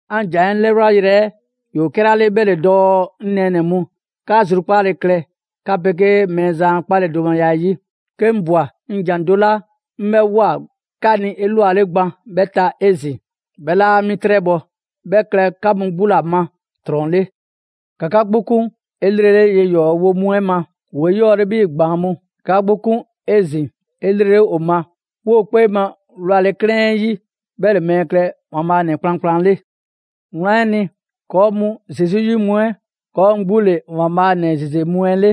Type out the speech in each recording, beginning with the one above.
'An ‑jan 'ɛ 'lɛyanyrɛ ‑yoo 'kɛla 'le 'bhɛ ‑le dɔɔ 'ŋ nɛɛnɛ‑ mu, 'ka zrukpaale klɛ 'ka 'pegee Mɛɛzan a 'kpaledomaya 'ɛ 'yi. 'Ke 'ŋ ꞊bwa 'ŋ ‑jan do 'la 'ŋ 'bhɛ ꞊woa 'ka ni 'elwale gban 'bhɛ ta 'ezin‑, 'bhɛ 'laa mi 'trɛbhɔ‑. 'Bhɛ klɛ 'ka mu 'gbu ‑la ma ‑trɔn 'le. ‑Ka 'ka 'gbu 'kun 'elrele ye ‑yɔɔ wo mu 'ɛ ma, ‑woo 'eyɔɔle 'bhii‑ ‑gbaan' mu. ‑Ka 'ka 'gbu 'kun 'ezin‑ 'elrele ‑o ma: 'Woo‑ 'kpee ma wlale 'klɛɛn 'yi 'ɛ 'bhɛ ‑le mɛɛ klɛ ‑Waanbhaa' ‑nɛ kplankplan 'le. Wlan 'ɛ ni, ‑kɔɔ' mu Zesu 'yi mu 'ɛ, ‑kɔɔ' mu 'gbu ‑le ‑Waanbhaa' ‑nɛ ‑zeze mu 'ɛ 'le.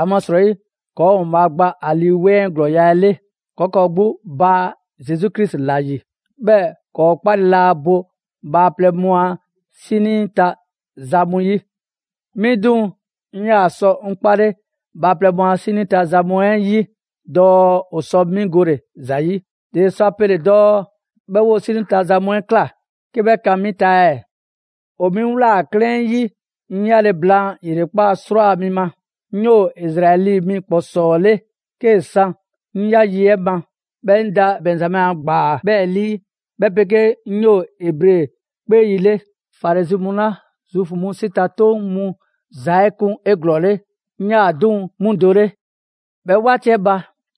‑Amasrɔyi ‑kɔɔ' ‑Waanbhaa' gba ‑a Lii 'Weŋ 'ɛ ‑glɔɔya' 'ɛ 'le. ‑Kɔɔ' ‑kɔɔ' 'gbu baa Zesu Krisi ‑la ‑yi. 'Bhɛɛ‑ ‑kɔɔ' 'kpale laa bo bhaaplɛŋ mu a 'sinii ta za mu 'yi. 'Mi 'duŋ‑, 'mi 'yaa‑ sɔ 'ŋ 'kpale bhaaplɛŋ mu a 'sinii ta ‑za mu 'ɛ 'yi dɔɔ ‑o sɔ 'mi gole ‑za 'yi. ‑Dele sɔ a pele dɔɔ 'bhɛ 'woo 'sinii ta za mu 'ɛ ꞊kla 'ke 'bhɛ kan 'mi ta ɛɛ? ‑O 'mi ꞊wlaa 'klɛɛn 'yi 'ŋ 'ya le blaan ‑yrekpaa' 'srwaa‑ mi ma. 'Ŋ 'yoo‑ Izraɛli mi ‑kpɔsɔɔ 'le 'kee‑ san 'ŋ ꞊ya yi 'ɛ ma, 'bhɛɛ‑ 'ŋ da Bɛnzamɛ a ‑gbaa 'bhɛɛ‑ 'lii, 'bhɛ 'pegee 'ŋ 'yoo‑ Ebre 'kpee yi 'le. Farizi mu 'la Zuufu mu 'si ta 'toŋ mu ‑za 'ɛ kun 'eglɔɔle, 'ŋ 'yaa‑ 'duŋ‑ 'mu do 'le. 'Bhɛ 'waati 'ɛ ba,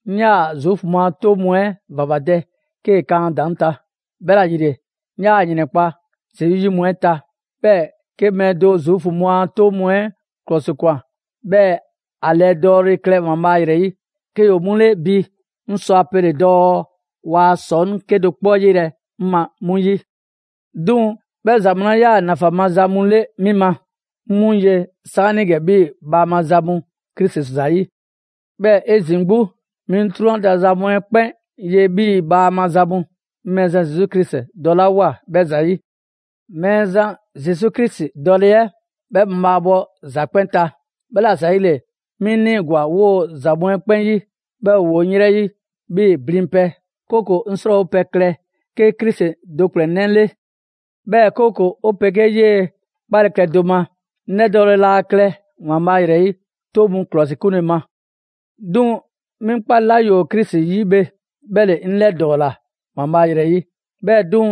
'ŋ 'yaa‑ Zuufu mu a 'toŋ mu 'ɛ ‑vavadɛ 'kee‑ kan a ‑daŋ' ta. 'Bhɛla‑ ‑yile, 'ŋ 'yaa‑ ‑yrɛnkpa' Zesu 'yi mu 'ɛ ta. 'Bhɛɛ‑ 'ke mɛɛ do Zuufu mu a 'toŋ mu 'ɛ 'klɔsikwan, 'bhɛɛ‑ ‑a ‑lɛdɔɔle klɛ ‑Waanbhaa' ‑yrɛ 'yi, 'ke ‑yoo 'mu 'le bi 'ŋ sɔ a pele‑ dɔɔ waa ‑sɔŋ' 'kedo‑ 'kpɔ 'yelɛ‑ 'ŋ ma 'mu 'yi. 'Duŋ‑ 'bhɛ ‑za mu 'la 'yaa‑ ‑nafan maza mu 'le 'mi ma, 'ŋ 'mu ye 'saanigɛ 'bhii‑ bhaama za mu Krisi ‑zayi'. 'Bhɛɛ‑ 'ezin‑ 'gbu, 'mi 'drunyan ta za mu 'ɛ 'kpɛn ye 'bhii‑ bhaama za mu, 'ŋ Mɛɛzan Zesu Krisi dɔlawoa 'bhɛ ‑zayi'. Mɛɛzan Zesu Krisi dɔle 'ɛ, 'bhɛ mabhaabhɔ ‑za 'kpɛn ta. 'Bhɛla‑ ‑zayile 'mi 'ŋ 'niigwa‑ 'woo‑ ‑za mu 'ɛ 'kpɛn 'yi, 'bhɛɛ‑ ‑woo 'ŋ yrɛ 'yi 'bhii‑ blinpɛ, 'kooko‑ 'ŋ 'srɔɔwopɛ klɛ 'ke Krisi do ‑kplɛnnɛ' 'le. 'Bhɛɛ‑ 'kooko‑ 'o 'pegee 'yee‑ 'kpale‑ klɛ do ma. 'Ŋ 'lɛdɔɔle 'laa klɛ ‑Waanbhaa' ‑yrɛ 'yi 'toŋ mu ‑klɔsikunle ma. 'Duŋ‑ 'mi 'ŋ 'kpale‑ 'la ‑yoo Krisi 'yi bhe, 'bhɛ ‑le 'ŋ 'lɛdɔɔla ‑Waanbhaa' ‑yrɛ 'yi. 'Bhɛɛ‑ 'duŋ‑,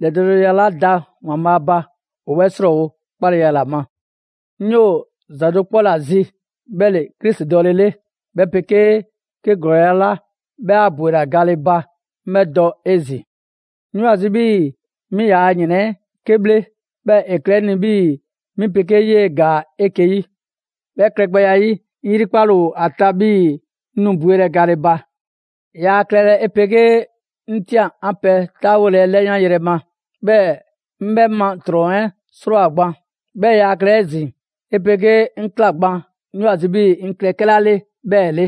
‑lɛdɔɔleya 'la da ‑Waanbhaa' ba ‑o 'bhɛ 'srɔɔwo‑ 'kpaleya ‑la ma. 'Ŋ 'yoo‑ ‑za do 'kpɔ 'la zi, 'bhɛ ‑le Krisi dɔle 'le, 'bhɛ 'pegee 'ke ‑glɔɔya' 'la 'bhɛ 'a ‑bwela ga le ba 'ŋ 'bhɛ dɔ 'ezin‑. 'Ŋ 'yoo‑ ‑a zi 'bhii‑ 'mi yaa ‑yrɛn 'ɛ 'ke 'bhle, 'bhɛɛ‑ ‑e klɛ 'ŋ ni 'bhii‑ 'mi 'pegee 'yee‑ ‑gaa 'eke‑ 'yi. 'Bhɛ klɛgbɛya 'ɛ 'yi, 'ŋ 'yrikpale ‑o ‑a ta 'bhii‑ 'ŋ nu bwelɛ gale ba. Yaa klɛlɛ 'e 'pegee‑ 'ŋ ꞊tian 'an pɛ 'taawole 'ɛ 'lɛyanyrɛ ma, 'bhɛɛ‑ 'ŋ 'bhɛ ma ‑trɔn 'ɛ 'srɔɔwoa‑ gban. 'Bhɛɛ‑ yaa klɛlɛ 'ezin‑ 'e 'pegee 'ŋ ꞊kla gban 'ŋ 'yoo‑ ‑a zi 'bhii‑ 'ŋ klɛ 'kɛla 'le 'bhɛɛ‑ 'le.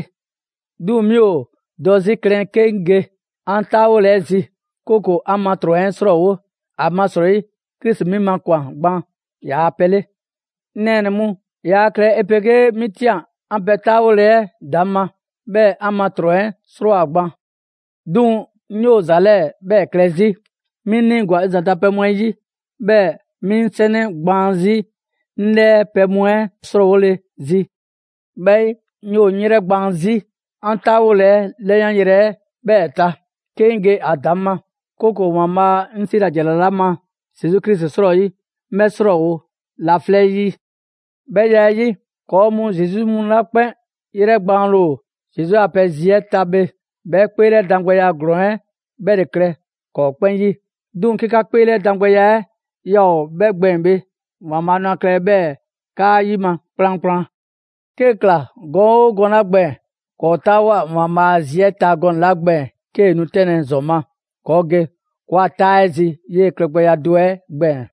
'Duŋ‑ mi ‑o dɔ 'zi klɛn 'ke 'ŋ ge 'an 'taawole 'ɛ zi, 'kooko‑ 'an ma ‑trɔn 'ɛ 'srɔɔwo‑, ‑amasrɔyi Krisi 'mi makwan‑ gban ‑yaa' pɛ 'le. 'Ŋ nɛɛnɛ‑ mu, yaa klɛlɛ 'e 'pegee 'mi ꞊tian 'an pɛ 'taawole 'ɛ ‑daŋ' ma, 'bhɛɛ‑ 'an ma ‑trɔn 'ɛ 'srɔɔwoa‑ gban. 'Duŋ‑ 'ŋ 'yoo‑ ‑za 'lɛɛ‑ 'bhɛɛ‑ klɛ zi: 'Mi 'ŋ 'niigo‑ 'ŋ ‑zanta' pɛ mu 'ɛ 'yi, 'bhɛɛ‑ 'mi 'ŋ 'sɛnɛ gbaan zii' 'ŋ 'lɛɛ pɛ mu 'ɛ 'srɔɔwole‑ zi. 'Bhɛ 'yi, 'ŋ 'yoo‑ 'ŋ 'yrɛgbaan‑ 'zi 'an 'taawole 'ɛ ‑lɛyanyrɛ 'ɛ 'bhɛɛ‑ ta, 'ke 'ŋ ge ‑a ‑daŋ' ma, 'kooko‑ ‑Waanbhaa' 'ŋ 'siila‑ ‑jara 'la ma Zesu Krisi 'srɔyi, 'ŋ 'bhɛ 'srɔɔwo‑ laflɛ' 'ɛ 'yi. 'Bhɛ ya 'ɛ 'yi, ‑kɔɔ' mu Zesu 'yi mu 'la 'kpɛn 'yrɛbakanle ‑o Zesu a pɛ zi 'ɛ ta bhe, 'bhɛ 'kpeelɛdangbɛya ‑glɔɔn 'ɛ 'bhɛ ‑le klɛ ‑kɔɔ' 'kpɛn 'yi. 'Duŋ‑ 'ke 'ka 'kpeelɛdangbɛya 'ɛ yaa ‑o 'bhɛ gbɛɛn bhe, ‑Waanbhaa' nu a klɛlɛ 'bhɛɛ‑ 'kaa 'yima‑ kplankplan. 'Kee‑ ꞊kla gɔn 'oo gɔnɛ‑ 'la gbɛɛn‑, ‑kɔɔ' 'taawoa꞊ ‑Waanbhaa' a zi 'ɛ ta gɔnɛ‑ 'la gbɛɛn‑ 'kee‑ nu 'tɛnlɛ‑ ‑zɔn ma, ‑kɔɔ' ge ‑kɔɔa' 'taa 'ɛ zi 'yee‑ klɛgbɛya do 'ɛ gbɛɛn‑.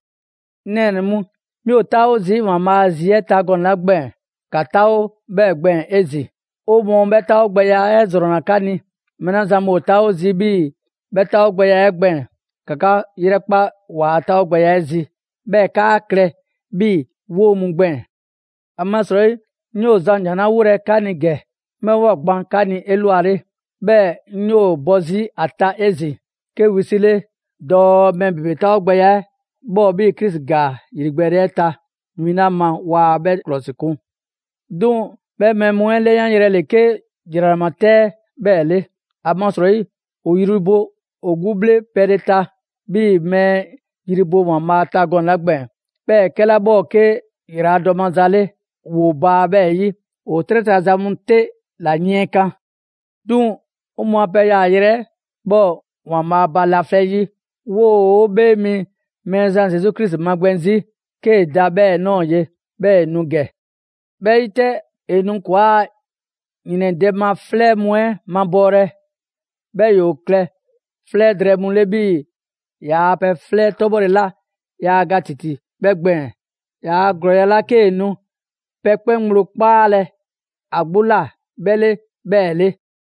'Ŋ nɛɛnɛ‑ mu, 'mi ‑o 'taawo zii' ‑Waanbhaa' a zi 'ɛ ta gɔnɛ‑ 'la gbɛɛn‑, ‑ka 'taawo 'bhɛɛ‑ gbɛɛn‑ 'ezin‑. 'O mɔɔ 'bhɛ 'taawogbɛya 'ɛ ‑zrɔnna 'ka ni. Mɛɛ 'la zan mu ‑o 'taawo zii' 'bhii‑ 'bhɛ 'taawogbɛya 'ɛ gbɛɛn‑, ‑ka 'ka 'yrɛkpa ‑waa' 'taawogbɛya 'ɛ zi, 'bhɛɛ‑ 'kaa klɛ 'bhii‑ 'woo mu gbɛɛn‑. ‑Amasrɔyi, 'ŋ 'yoo‑ zan ‑jan 'la 'wolɛ‑ 'ka ni ‑gɛ, 'ŋ 'bhɛ ꞊woa gban 'ka ni 'elwale, 'bhɛɛ‑ 'ŋ 'yoo‑ bɔ 'zi ‑a ta 'ezin‑ 'ke wisile 'le dɔɔ mɛɛ ‑bebe 'taawogbɛya 'ɛ 'bhɛ ‑o 'bhii‑ Krisi ‑gaa ‑yrigbɛɛle 'ɛ ta win 'la ma waa 'bhɛ 'klɔsikun. 'Duŋ‑ 'bhɛ mɛɛ mu 'ɛ 'lɛyanyrɛ ‑le 'ke ‑jranama 'tɛ 'ɛ 'bhɛɛ‑ 'le. ‑Amasrɔyi ‑o yri bo ‑o bhle pɛle ta 'bhii‑ mɛɛ yri bo ‑Waanbhaa' ta gɔnɛ‑ 'la gbɛɛn‑, 'bhɛɛ‑ 'kɛla 'bhɛ ‑o 'ke ‑yraladɔ maza 'le, ‑woo baa 'bhɛɛ‑ 'yi. ‑O 'trɛ ta za mu 'te ‑la yiɛnkan. 'Duŋ‑ 'o mɔɔ a pɛ yaayrɛ 'ɛ 'bhɛ ‑o ‑Waanbhaa' ba laflɛ' 'yi. 'Woo‑ 'Bhee Mi Mɛɛzan Zesu Krisi magbɛn 'zi, 'kee‑ da 'bhɛ ꞊nɔɔ ye, 'bhɛɛ‑ ‑e nu ‑gɛ. 'Bhɛ 'yi 'tɛ, ‑e nu ‑kɔɔa' ‑yrɛndɛ' ma 'flɛ mu 'ɛ mabɔɔlɛ, 'bhɛɛ ‑yoo klɛ 'flɛ drɛɛ mu 'le 'bhii‑ ‑yaa' pɛ 'flɛ 'tɔbhɔle 'la yaa ga ‑titi 'bhɛ gbɛɛn‑, ‑yaa' ‑glɔɔya' 'la 'kee nu pɛ 'kpɛn ŋgblo 'kpaalɛ‑ ‑a 'gbu ꞊la 'bhɛ 'le 'bhɛɛ‑ 'le.